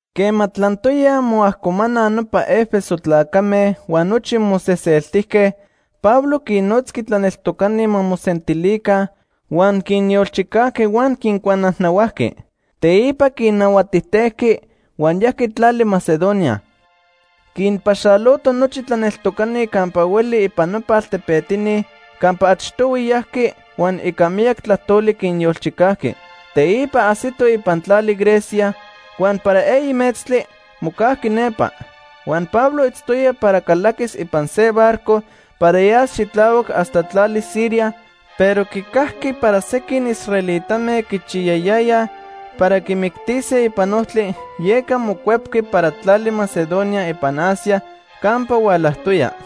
Quema tlantoyaj moajcomanaj nopa Éfeso tlacame huan nochi moseseltijque, Pablo quinnotzqui tlaneltocani ma mosentilica huan quinyolchicajqui huan quincuanajnahuajqui. Teipa quinahuatijtejqui huan yajqui tlali Macedonia. Quinpaxaloto nochi tlaneltocani campa hueli ipan nopa altepetini campa achtohui yajqui huan ica miyac tlajtoli quinyolchicajqui. Teipa ajsito ipan tlali Grecia, huan para eyi metztli mocajqui nepa. Huan Pablo itztoya para calaquis ipan se barco para yas xitlahuac hasta tlali Siria, pero quicajqui para sequin israelitame quichiyayayaj para quimictise ipan ojtli, yeca mocuepqui para tlali Macedonia ipan Asia campa hualajtoya.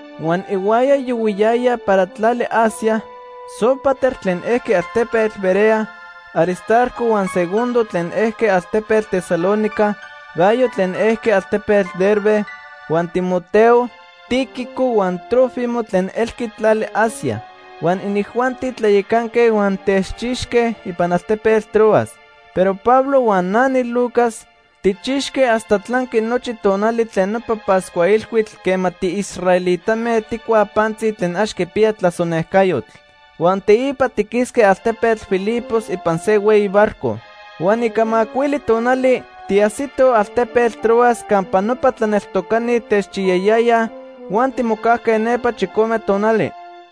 Huan ihuaya yohuiyayaj para tlali Asia, Sópater tlen ejqui altepetl Berea, Aristarco huan Segundo tlen ejque altepetl Tesalónica, Gayo tlen ejqui altepetl Derbe, huan Timoteo, Tíquico huan Trófimo tlen ejque tlali Asia. Huan inijuanti tlayacanque huan techchixque ipan altepetl Troas. Pero Pablo huan na niLucas, tijchixque hasta tlanqui nochi tonali tlen nopa Pascua Ilhuitl quema tiisraelitame tijcuaj pantzi tlen ax quipiya tlasonejcayotl. Huan teipa tiquisque altepetl Filipos ipan se hueyi barco. Huan ica macuili tonali tiajsitoj altepetl Troas campa nopa tlaneltocani techchiyayayaj huan timocajque nepa chicome tonali.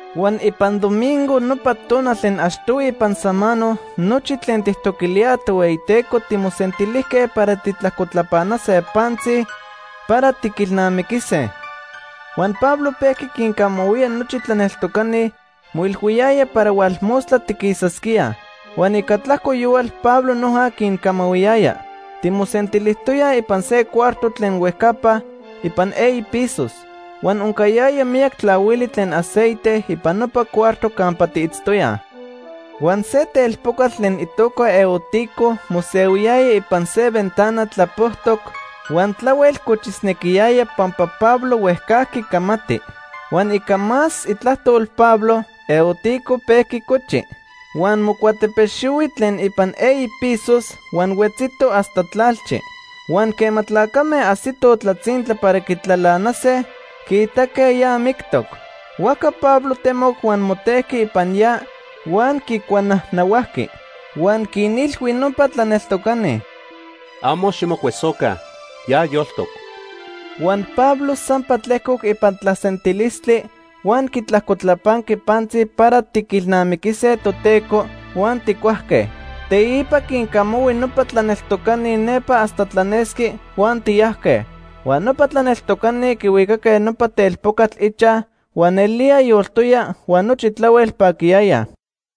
Huan ipan domingo, nopa tonal tlen achtohui ipan samano, nochi tlen tijtoquilíaj Tohueyiteco timosentilijque para tijtlajcotlapanase pantzi para tiquilnamiquise. Huan Pablo pejqui quincamahuía nochi tlaneltocani, moilhuiyaya para hualmostla tiquisasquíaj. Huan ica tlajco yohual Pablo noja quincamahuiyaya. Timosentilijtoyaj ipan se cuarto tlen huejcapa ipan eyi pisos. Huan oncayaya miyac tlahuili tlen aceite ipan nopa cuarto campa tiitztoyaj. Huan se telpocatl tlen itoca Eutico mosehuiyaya ipan se ventana tlapojtoc huan tlahuel cochisnequiyaya pampa Pablo huejcajqui camati. Huan ica más itlajtol Pablo, Eutico pejqui cochi. Huan mocuatepexihui tlen ipan eyi pisos huan huetzito hasta tlalchi. Huan quema tlacame ajsitoj tlatzintla para quitlalanase, quiitaque ya mictoc. Huajca Pablo temoc huan motejqui ipan ya huan quicuanajnahuajqui. Huan quinilhui nopa tlaneltocani: ―Amo ximocuesoca. Ya yoltoc. Huan Pablo sampa tlejcoc ipan tlasentilistli huan quitlajcotlapanqui pantzi para tiquilnamiquise Toteco, huan tijcuajque. Teipa quincamahui nopa tlaneltocani nepa hasta tlanesqui, huan tiyajque. Huan nopa tlaneltocani quihuicaque nopa telpocatl ichaj huan nelía yoltoya huan nochi tlahuel paquiyayaj.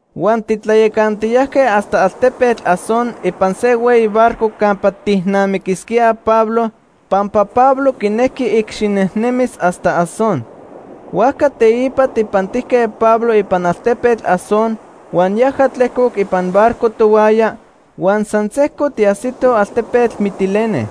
Huan titlayacantiyajque hasta altepetl Asón ipan se hueyi barco campa tijnamiquisquíaj Pablo, pampa Pablo quinejqui icxinejnemis hasta Asón. Huajca teipa tijpantijque Pablo ipan altepetl Asón huan yaja tlejcoc ipan barco tohuaya, huan san sejco tiajsitoj altepetl Mitilene.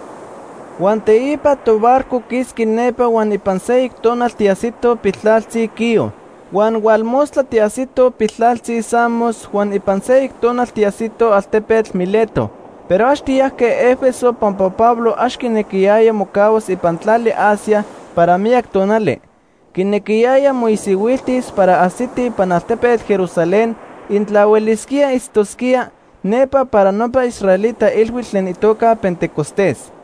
Huan teipa tobarco quisqui nepa huan ipan seyoc tonal tiajsitoj piltlaltzi Quío. Huan hualmostla tiajsitoj piltlaltzi Samos, huan ipan seyoc tonal tiajsitoj altepetl Mileto. Pero ax tiyajque Éfeso pampa Pablo ax quinequiyaya mocahuas ipan tlali Asia para miyac tonali. Quinequiyaya moisihuiltis para ajsiti ipan altepetl Jerusalén intla huelisquía itztosquía nepa para nopa israelita ilhuitl tlen itoca Pentecostés.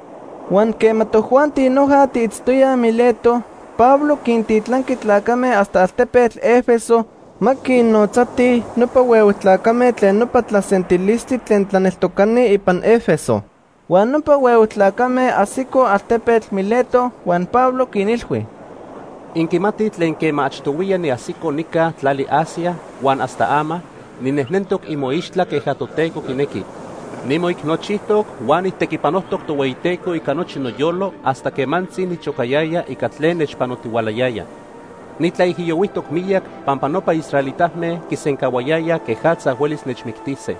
Huan quema tojuanti noja tiitztoyaj Mileto, Pablo quintitlanqui tlacame hasta altepetl Éfeso ma quinnotzatij nopa huehue tlacame tlen nopa tlasentilistli tlen tlaneltocani ipan Éfeso. Huan nopa huehue tlacame ajsicoj altepetl Mileto huan Pablo quinilhui: “Inquimatij tlen quema achtohuiya niajsico nica tlali Asia huan hasta ama, ninejnentoc imoixtla queja Toteco quinequi. Nimoicnochijtoc huan nijtequipanojtoc Tohueyiteco ica nochi noyolo hasta quemantzi nichocayaya ica tlen nechpanotihualayaya. Nitlaijiyohuijtoc miyac pampa nopa israelitame quisencahuayayaj quejatza huelis nechmictise.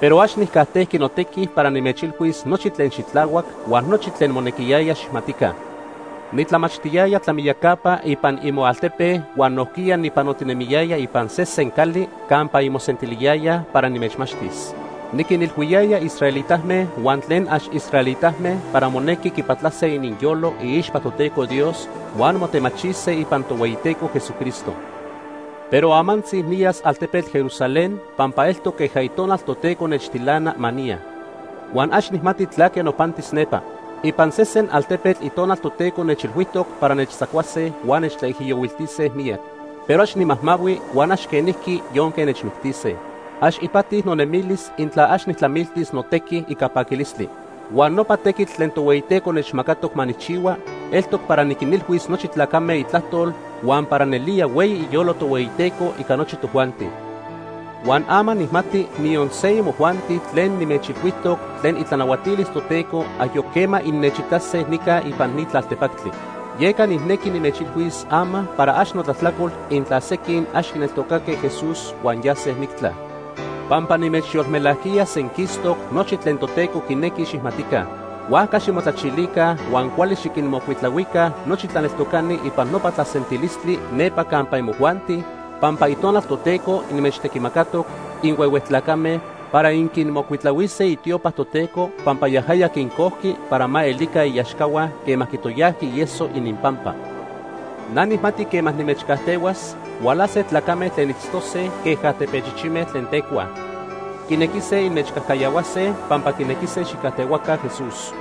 Pero ax nijcajtejqui notequi para nimechilhuis nochi tlen xitlahuac huan nochi tlen monequiyaya xijmatica. Nitlamachtiyaya tlamiyacapa ipan imoaltepe huan nojquiya nipanotinemiyaya ipan sesen cali campa inmosentiliyayaj para nimechmachtis. Niquinilhuiyaya israelitame huan tlen ax israelitame para monequi quipatlase ininyolo iixpa Toteco Dios huan motemachise ipan Tohueyiteco Jesucristo. Pero amantzi niyas altepetl Jerusalén pampa eltoc queja Itonal Toteco nechtilana ma niya. Huan ax nijmati tlaque nopantis nepa. Ipan sesen altepetl Itonal Toteco nechilhuijtoc para nechtzacuase huan nechtlaijiyohuiltise miyac. Pero ax nimajmahui huan ax quenijqui yonque nechmictise. Ax ipati nonemilis intla ax nijtlamiltis notequi ica paquilistli. Huan nopa tequitl tlen Tohueyiteco nechmacatoc ma nijchihua eltoc para niquinilhuis nochi tlacame itlajtol huan para nelía hueyi iyolo Tohueyiteco ica nochi tojuanti. “Huan ama nijmati niyon se imojuanti tlen nimechilhuijtoc tlen itlanahuatilis Toteco ayoc quema innechitase nica ipan ni tlaltepactli. Yeca nijnequi nimechilhuis ama para ax notlajtlacol intla sequin ax quineltocatoque Jesús huan yase mictla. Pampa nimechyolmelajquiya senquistoc nochi tlen Toteco quinequi xijmatica. Huajca ximotlachilica huan cuali xiquinmocuitlahuica nochi tlaneltocani ipan nopa tlasentilistli nepa campa imojuanti pampa Itonal Toteco inmechtequimacatoc inhuehue tlacame para inquinmocuitlahuise itiopa Toteco pampa yajaya quincojqui para ma elica iaxcahua quema quitoyajqui ieso ininpampa. Na nijmati quema nimechcajtehuas, hualase tlacame tlen itztose queja tepechichime tlen tecuaj. Quinequise inmechcajcayahuase pampa quinequise xijcajtehuaca Jesús.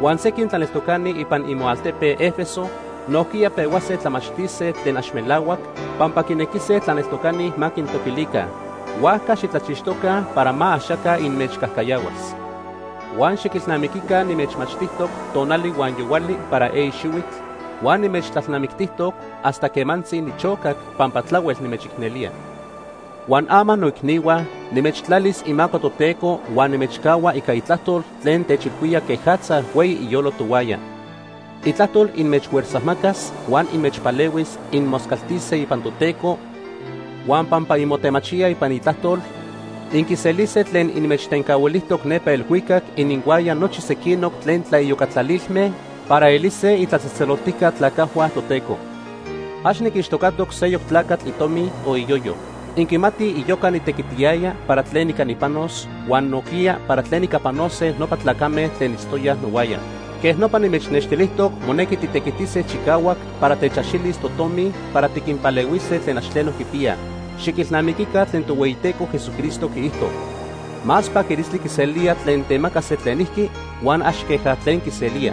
Huan sequin tlaneltocani ipan imoaltepe Éfeso nojquiya pehuase tlamachtise tlen ax melahuac pampa quinequise tlaneltocani ma quintoquilica. Huajca xitlachixtoca para ma axaca inmechcajcayahuas. Huan xiquilnamiquica nimechmachtijtoc tonali huan yohuali para eyi xihuitl, huan nimechtlalnamictijtoc hasta quemantzi nichocac pampa tlahuel nimechicnelía. “Huan ama noicnihua, nimechtlalis imaco Toteco huan nimechcahua ica itlajtol tlen techilhuía quejatza hueyi iyolo tohuaya. Itlajtol inmechfuerzajmacas huan inmechpalehuis inmoscaltise ipan Toteco huan pampa inmotemachíaj ipan itlajtol, inquiselise tlen inmechtencahuilijtoc nepa elhuicac ininhuaya nochi sequinoc tlen tlaiyocatlalilme para elise itlatzejtzeloltijca tlacajhua Toteco. Ax niquixtocatoc seyoc tlacatl itomi o iyoyo. Inquimatij iyoca nitequitiyaya para tlen ica nipanos huan nojquiya para tlen ica panose nopa tlacame tlen itztoyaj nohuaya. Quej nopa nimechnextilijtoc monequi titequitise chicahuac para techaxilis totomi para tiquinpalehuise tlen ax tleno quipiyaj. Xiquilnamiquica tlen Tohueyiteco Jesucristo quiijto: ‘Más paquilistli quiselía tlen temaca se tlenijqui, huan ax queja tlen quiselía.’”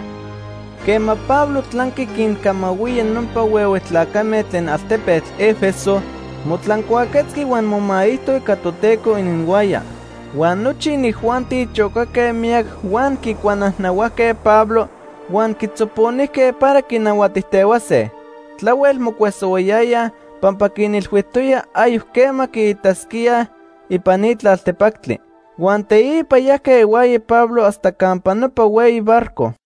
Quema Pablo tlanqui quincamahuía nopa huehue tlacame tlen altepetl Éfeso, motlancuaquetzqui huan momaijto ica Toteco ininhuaya. Huan nochi inijuanti chocaque miyac huan quicuanajnahuajque Pablo huan quitzoponijque para quinahuatijtehuase. Tlahuel mocuesohuayayaj pampa quinilhuijtoya ayoc quema quiitasquíaj ipan ni tlaltepactli. Huan teipa yajque ihuaya Pablo hasta campa nopa hueyi barco.